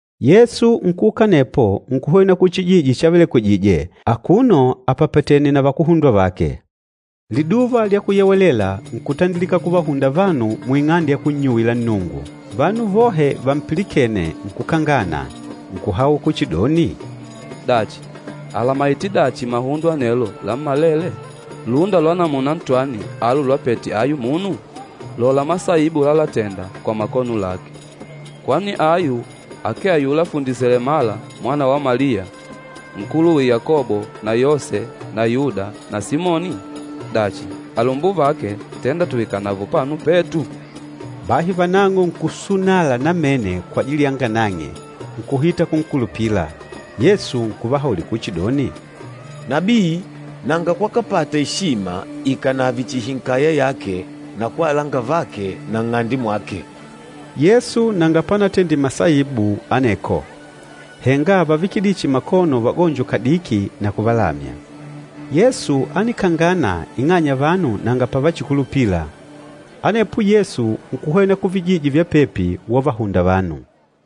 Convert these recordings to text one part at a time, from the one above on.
Yesu nkuuka anepo nkuhwena kuchijiji chavelekwije, akuno apapatènè na vakuhundwa vake. Liduva lya Kuyewelela, nkutandilika kuvahunda vanu muing'ande ya kunnyuwila Nnungu. Vanu vohe vampilikêne nkukangana, nkuhaula kuchidoni, “Dachi, àlamaite dachi mahundo anelo lammalele? Lúnda lwa namuna ntwani alu lwapete ayu munu? Lola masaibu lalatenda kwa makono lake! Kwani ayu akee ayula fundi selemala mwana wa Maliya, nkuluwe Yakobo na Yose na Yuda na Simoni? Dachi, alumbuvake tenda tuikanavo upano petu?” Bahi vanang'o nkusunala namene kwajili yanga nang'e, nkuhita kunkulupila. Yesu nkuvahaulila kuchidoni, “Nabii nanga kwakapata eshima ikànave chihi nkaya yake na kwa alangavake na nng'ande mwake.” Yesu nanga panatendile masaibu aneko, henga ávavikidile chihi makono vagonjo kadiki na kuvalamya. Yesu ánikangana ing'anya vanu nanga pavachikulupila. Anepo Yesu nkuhwena kuvijiji vya pepi, wavahunda vanu.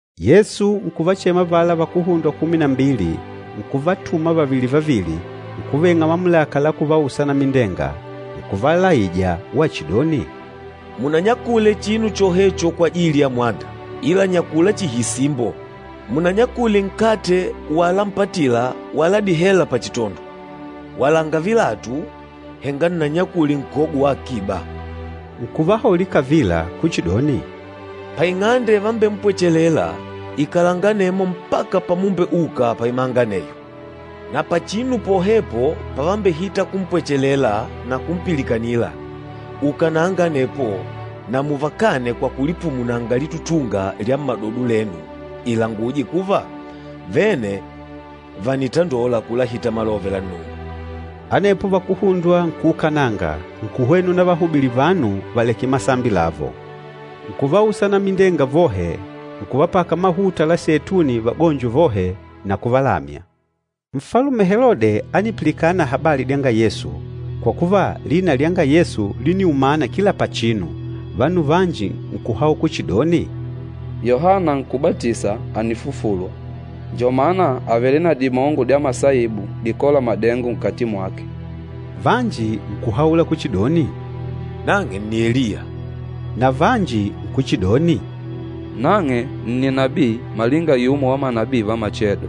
Yesu nkuvachema avala vakuhundwa kumi na mbili, nkuvatuma vavili-vavili. Nkuveng'a mamulaka la kuvausa anamindenga. Nkuvalaija wachidoni, “Munanyakule chinu chohecho kwajili ya mwanda, ila nyakula chihi isimbo. Munanyakule nkate wala mpatila wala dihela pachitondo. Walanga vilatu, henga nnanyakule nkogo wa akiba.” Nkuvahaulila kavila kuchidoni, “Paing'ande ivambempwechelela, ikalanga anemo mpaka pamumbeuka paimanga aneyo. Na pachinu pohepo pavambehita kumpwechelela na kumpilikanila, ukananga anepo na muvakane kwa kulipumunanga litutunga lya mmadodo lenu ilanguje kuva, vene vànitandola kulahita malove la Nnungu.” Anepo vakuhundwa nkuukananga, nkuhwena unavahubilila vanu valeke masambi lavo. Nkuvausa anamindenga vohe, nkuvapaka mahuta la seituni vagonjo vohe, na kuvalamya. Nfalume Helode ánipilikana habali dyanga Yesu, kwa kuva lina lyanga Yesu líniumana kila pachinu. Vanu vanji nkuhaula kuchidoni, “Yohana Nkúbatisa ànifufulwa, njo mana àvele na dimongo dya masaibu dikôla madengo nkati mwake.” Vanji nkuhaula kuchidoni, “Nang'e nni Eliya.” Na vanji nkuchidoni, “Nang'e nni nabii malinga yumo wa manabii va machedo.”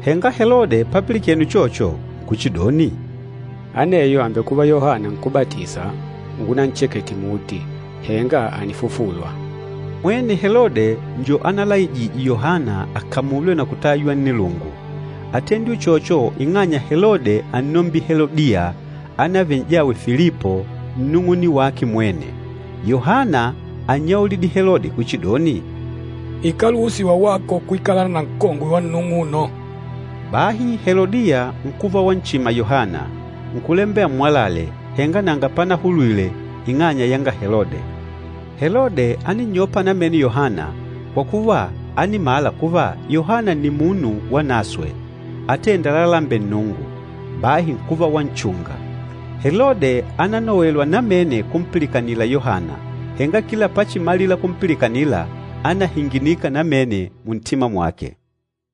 Henga Helode papilikene uchocho, nkuchidoni, “Aneyo àmbekuva Yohana Nkúbatisa ungunanchekete muti, henga ànifufulwa!” Mwene Helode njo ánalaijije Yohana akamulwe na kutaywa nnilungu. Átendile uchocho ing'anya Helode ánnombile Helodiya, ánavele n'jawe Filipo, nnung'une wake mwene. Yohana ánnyaulidile Helode kuchidoni, “Ikáluhusiwa wako kwikalana na nkongwe wa nnung'uno.” Bahi Helodiya nkuva wanchima Yohana, nkulambela ammwalale, henga nanga panahulwile ing'anya yanga Helode. Helode áninnyopa namene Yohana kwa kuva ánimala kuva Yohana nni munu wanaswe atênda lalalembela Nnungu, bahi nkuva wanchunga. Helode ánanowelwa namene kumpilikanila Yohana, henga kila pachimalila kumpilikanila, ánahinginika namene muntima mwake.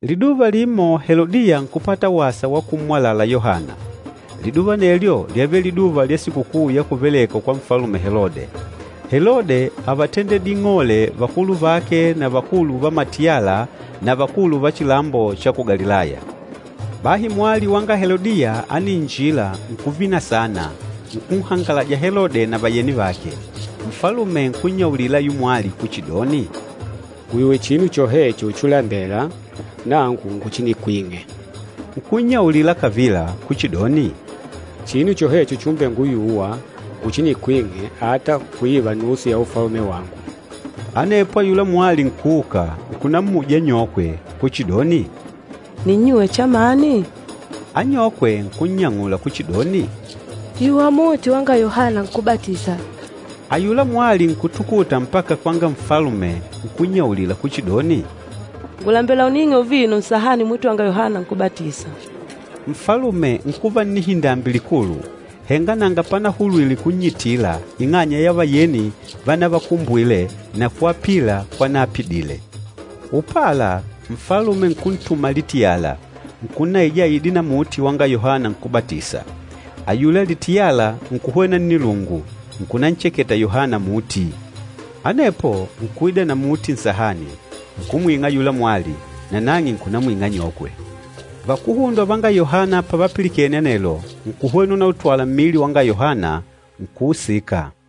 Liduva limo Helodiya nkupata wasa wa kummwalala Yohana. Liduva anelyo lyávele liduva lya sikukuu ya kuvelekwa kwa Nfalume Helode. Helode ávatendedile ing'ole vakulu vake na vakulu va matiyala na vakulu va chilambo cha ku Galilaya. Bahi mwali wanga Helodiya ániinjila nkuvina saana, nkunhangalaja Helode na vayeni vake. Nfalume nkunnyaulila ayula mwali kuchidoni, “Nguyuwe chinu chohecho chulambela, nangu nguchinikwing'e.” Nkunnyaulila kavila kuchidoni, “Chinu chohecho chumbenguyuwa, nguchinikwing'e ata kuiva nusu ya ufalume wangu.” Anepo ayula mwali nkuuka, nkunammuja anyokwe kuchidoni, “Ninnyuwe chamani?” Anyokwe nkunnyang'ula kuchidoni, “Yuwa muti wanga Yohana Nkúbatisa.” Ayula mwali nkutukuta mpaka kwanga nfalume nkunnyaulila kuchidoni, “Ngùlembela uning'e uvino nsahani muti wanga Yohana Nkúbatisa.” Nfalume nkuva nnihindambi likulu, henga nanga panahulwile kunnyitila ing'anya ya vayeni vanavakumbwile na kwapila kwanaapidile. Upala, nfalume nkuntuma litiyala, nkunnaija aide na muti wanga Yohana Nkúbatisa. Ayula litiyala nkuhwena nnilungu, nkunancheketa Yohana muti. Anepo nkuida na muti nsahani, nkumwing'a ayula mwali, nanang'e nkunamwing'a anyokwe. Vakuhundwa vanga Yohana pavapilikene anelo, nkuhwena unautwala mmili wanga Yohana, nkuusika.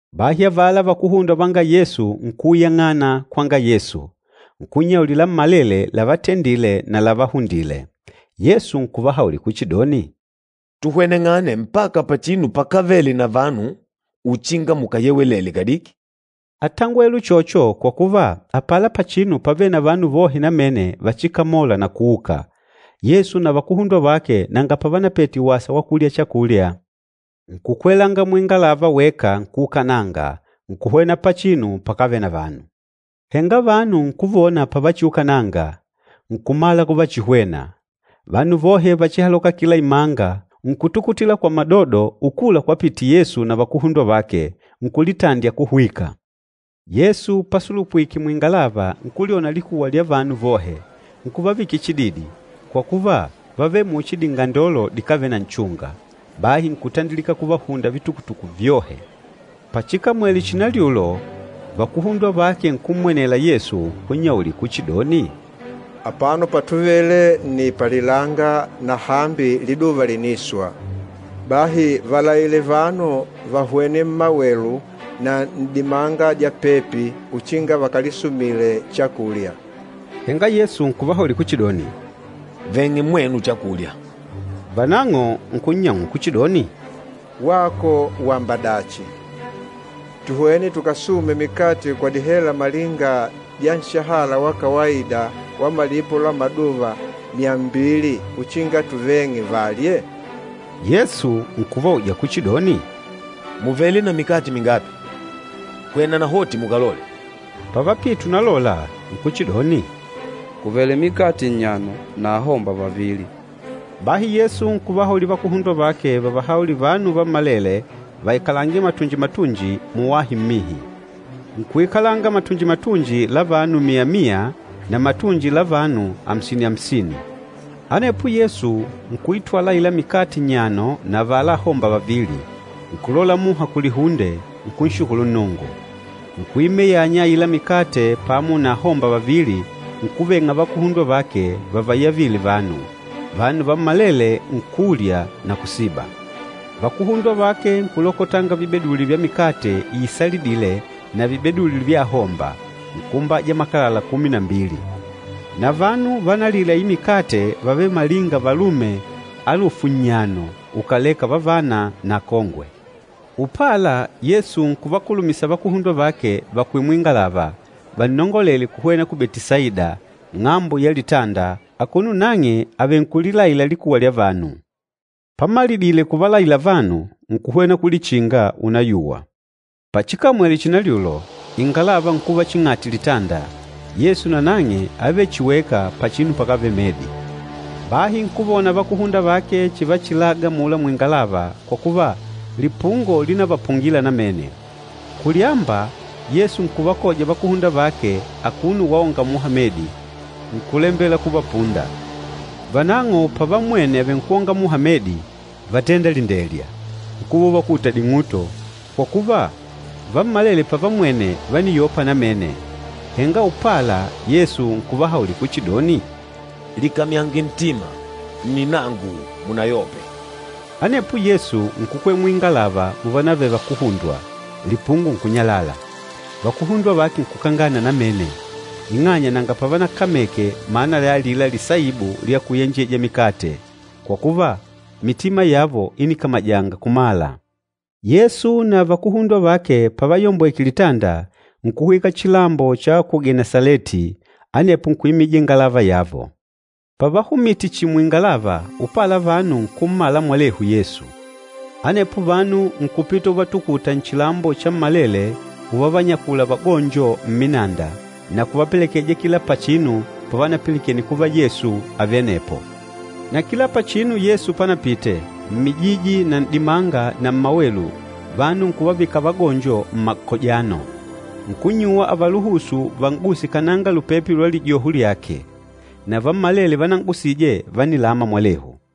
Bahi avala vakuhundwa vanga Yesu nkuuyang'ana kwanga Yesu, nkunnyaulila lammalele lávatendìlè na lávahundìlè. Yesu nkuvahaulila kuchidoni, “Tuhweneng'ane mpaka pachinu pakávele na vanu uchinga mukayewelele kadiki.” Átangwele uchocho kwa kuva apala pachinu pávele na vanu vohe namene vachikamola na kuuka. Yesu na vakuhundwa vake nanga pavanapete wasa wa kulya chakulya. Nkukwelanga muingalava weka nkuukananga, nkuhwena pachinu pakávele na vanu. Henga vanu nkuvona pavachiukananga, nkumala kuvachihwena. Vanu vohe vachihaloka kila imanga, nkutukutila kwa madodo ukula kwapite Yesu na vakuhundwa vake, nkulitandya kuhwika. Yesu pasulupwike muingalava, nkulyona likuwa lya vanu vohe, nkuvavikila chididi, kwa kuva vávele muchi dingandolo dikávele na nchunga. Bahi nkutandilika kuvahunda vitukutuku vyohe. Pachikamwele chinalyulo, vakuhundwa vake nkummwenela Yesu, nkunnyaulila kuchidoni, “Apano patuvele nni palilanga na hambi liduva lìniswa. Bahi valaile vanu vahwene mmawelu na n'dimanga dya pepi uchinga vakalisumile chakulya.” Henga Yesu nkuvahaulila kuchidoni, “Veng'e mwenu chakulya.” Vanang'o nkunnyang'ula kuchidoni, “Wako wamba dachi, tuhwene tukasume mikate kwa dihela malinga dya nshahala wa kawaida wa malipo la maduva myambili uchinga tuveng'e valye?” Yesu nkuvauja kuchidoni, “Mùvele na mikate mingapi? Hwena nahoti mukalole.” Pavapite unalola nkuchidoni, “Kùvele mikate nnyano na ahomba vavili.” Bahi Yesu nkuvahaulila vakuhundwa vake vavahaulile vanu vammalele vaikalange matunji-matunji, muwahi mmihi. Nkuikala matunji-matunji la vanu mia-mia na matunji la vanu amsini-amsini. Anepo Yesu nkuitwala aila mikate nnyano na avala ahomba vavili, nkulola muha kulihunde, nkunshukulu Nnungu. Nkuimeyanya aila mikate pamo na ahomba vavili, nkuveng'a vakuhundwa vake vavayavile vanu. Vanu vammalele nkulya na kusiba. Vakuhundwa vake nkulokotanga vibeduli vya mikate iisalidîle na vibeduli vya ahomba, nkuumbaja makalala kumi na mbili. Na vanu vanalile aila mikate vávele malinga valume alufu nnyano ukàleka vavana na akongwe. Upala Yesu nkuvakulumisa vakuhundwa vake vakwele muingalava, vannongolele kuhwena ku Betisaida, ng'ambo ya litanda, akuno nang'e avenkulilaìlà likuwa lya vanu. Pamalidile kuvalaila vanu, nkuhwena kulichinga unayuwa. Pachikamwele chinalyulo, ingalava nkuva ching'ati litanda, Yesu nanang'e ávele chihi weka pachinu pakávele medi. Bahi nkuvona vakuhundwa vake chivachilaga amula muingalava, kwa kuva, lipungo línavapungila namene. Kulyamba, Yesu nkuvakoja vakuhundwa vake akuno waonga muha medi, nkùlembela kuvapunda. Vanang'o pavammwene avenkwòngà muha medi, vátenda lindelya, nkuva uvakuta ding'uto, kwa kuva, vammalele pavammwene vániyopa namene. Henga upala Yesu nkuvahaulila kuchidoni, “Likamyange ntima, nni nangu! Munayope!” Anepo Yesu nkukwela muingalava muvanavele vakuhundwa, lipungo nkunyalala. Vakuhundwa vake nkukangana namene, ing'anya nanga pavanakameke mana ya alila lisaibu lya kuyenjeja mikate, kwa kuva, mitima yavo ínikamajanga kumala. Yesu na vakuhundwa vake pavayombweke litanda, nkuhwika chilambo cha ku Genesaleti, anepo nkuimija ingalava yavo. Pavahumite chihi muingalava, upala vanu nkummala mwelehu Yesu. Anepo vanu nkupita uvatukuta nchilambo chammalele uvavanyakula vagonjo mminanda, na kuvapelekeja kila pachinu pavanapilikene kuva Yesu àvele anepo. Na kila pachinu Yesu panapite, mmijiji na n'dimanga na mmawelu, vanu nkuvavika vagonjo mmakojano. Nkunnyuwa avaluhusu van'guse kananga lupepe lwa lijoho lyake. Na vammalele vanan'gusije vánilama mwalehu.